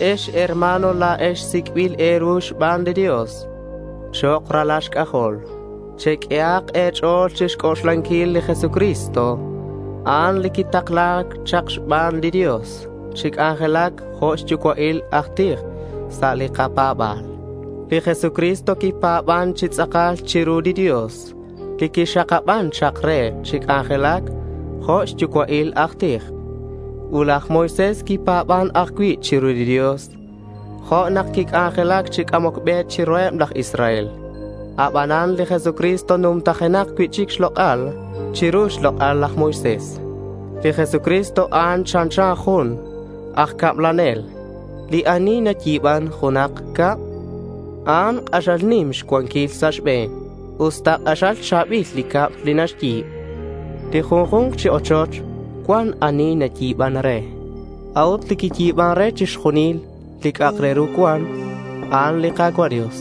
Ex herma̱n, la̱ex sic'bil e̱ru xban li Dios chok' ralal xc'ajol. Cheq'uehak e̱ch'o̱l chixc'oxlanquil li Jesucristo. A'an li quitakla̱c chak xban li Dios chi c'anjelac jo' xyucua'il aj tij sa' li kapa̱ba̱l. Li Jesucristo quipa̱ban chi tz'akal chiru li Dios li quixakaban chak re chi c'anjelac jo' xyucua'il aj tij. Ut laj Moisés quipa̱ban ajcui' chiru li Dios nak quic'anjelac chi c'amoc be chiruheb laj Israel. Abanan li Jesucristo numtajenak cui'chic xlok'al chiru xlok'al laj Moisés. Li Jesucristo, a'an chanchan jun aj cablanel. Li ani nayi̱ban junak cab, a'an k'axal nim xcuanquil sa' xbe̱n usta k'axal cha̱bil li cab li naxyi̱b. Li junju̱nk chi ochoch cuan ani nayi̱ban re; a'ut li quiyi̱ban re chixjunil li c'a'ak re ru cuan, a'an li Ka̱cua' Dios.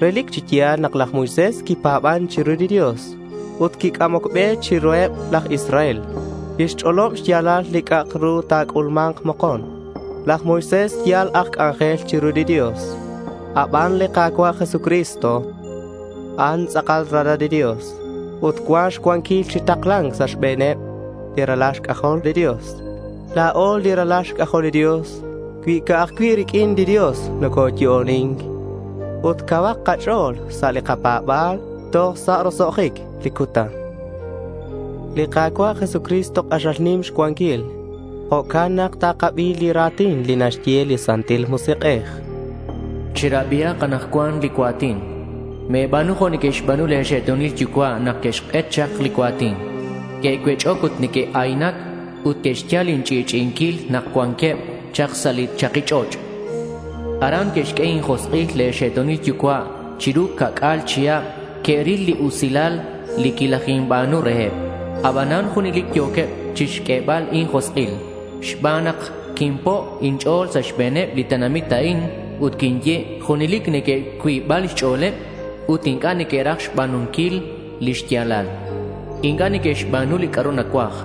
Relic chi ya̱l nak laj Moisés quipa̱ban chiru li Dios ut quic'amoc be chiruheb laj Israel. Quixch'olob xya̱lal li c'a'ru ta̱c'ulma̱nk mokon. Laj Moisés yal aj c'anjel chiru li Dios. Aban li Ka̱cua' Jesucristo, a'an tz'akal Ralal li Dios ut cuan xcuanquil chi takla̱nc sa' xbe̱neb li ralal xc'ajol li Dios. La̱o li ralal xc'ajol li Dios cui ca'aj cui' riq'uin li Dios nocoyo'onin ut cauhak kach'o̱l sa' li kapa̱ba̱l toj sa' roso'jic li cutan. Li Ka̱cua' Jesucristo k'axal nim xcuanquil. Jo'can nak takabi li ra̱tin li naxye li Santil Musik'ej: Cherabihak anakcuan li cua̱tin. Me̱ba̱nu jo' que'xba̱nu le̱ xe'to̱nil yucua' nak que'xk'et chak li cua̱tin. Que'cuech'oc ut neque'ayaynac ut que'xyal inch'i'ch'i'inquil nak cuanqueb chak sa' li chaki ch'och'. Aran que'xq'ue injosk'il le̱ xe'to̱nil yucua'. Chiru ca'c'a̱l chihab que'ril li usilal li quilajinba̱nu reheb. Abanan junelic yo̱queb chixq'uebal injosk'il. Xban a'an nak quinpo' inch'o̱l sa' xbe̱neb li tenamit a'in. Ut quinye: Junelic neque'xcuiba xch'o̱leb ut inc'a' neque'raj xba̱nunquil lix ya̱lal. Inc'a' neque'xba̱nu li c'a'ru nacuaj.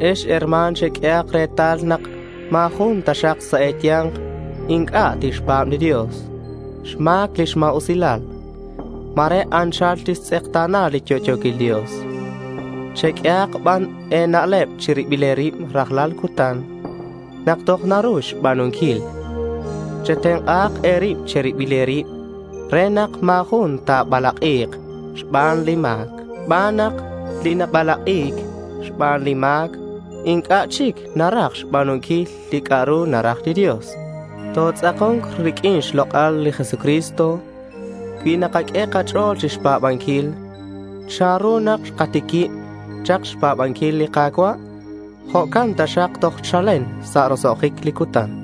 Ex herma̱n, cheq'uehak retal nak ma̱ jun taxak sa' e̱ya̱nk inc'a' tixpa̱b li Dios xma̱c lix ma̱usilal. Ma̱re anchal tixtz'ekta̱na li yo'yo̱quil Dios. Cheq'uehak ban e̱na'leb che̱ribil e̱rib rajlal cutan nak toj naru xba̱nunquil. Chetenk'a e̱rib che̱ribil e̱rib re nak ma̱ jun ta̱balak'i̱k xban li ma̱c, xban nak li nabalak'i̱c xban li ma̱c inc'a' chic naraj xba̱nunquil li c'a'ru naraj li Dios. Totz'ako̱nk riq'uin xlok'al li Jesucristo cui nakaq'ue kach'o̱l chixpa̱banquil. Chanru nak xkatiquib chak xpa̱banquil li Ka̱cua', jo'can taxak toj chalen sa' roso'jic li cutan.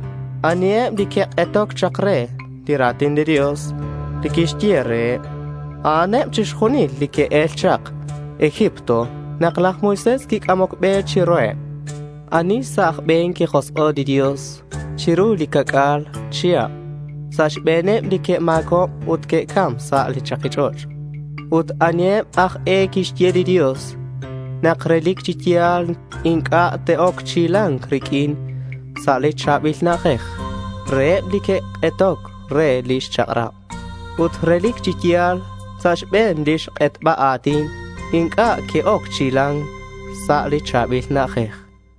¿Aniheb li que'k'etoc chak re li ra̱tin li Dios li quixye reheb? A'aneb chixjunileb li que'el chak Egipto nak laj Moisés quic'amoc be chiruheb. ¿Ani sa' aj be̱n quijosk'o' li Dios chiru li ca'c'a̱l chihab? Sa' xbe̱neb li que'ma̱cob ut que'cam sa' li chaki ch'och'. Ut, ¿aniheb aj e quixye li Dios nak relic chi ya̱l inc'a' te'oc chi hila̱nc riq'uin sa' li cha̱bil na'ajej? Reheb li que'k'etoc re lix chak'rab. Ut relic chi ya̱l xbaneb lix k'etba a̱tin, inc'a' que'oc chi hila̱nc sa' li cha̱bil na'ajej.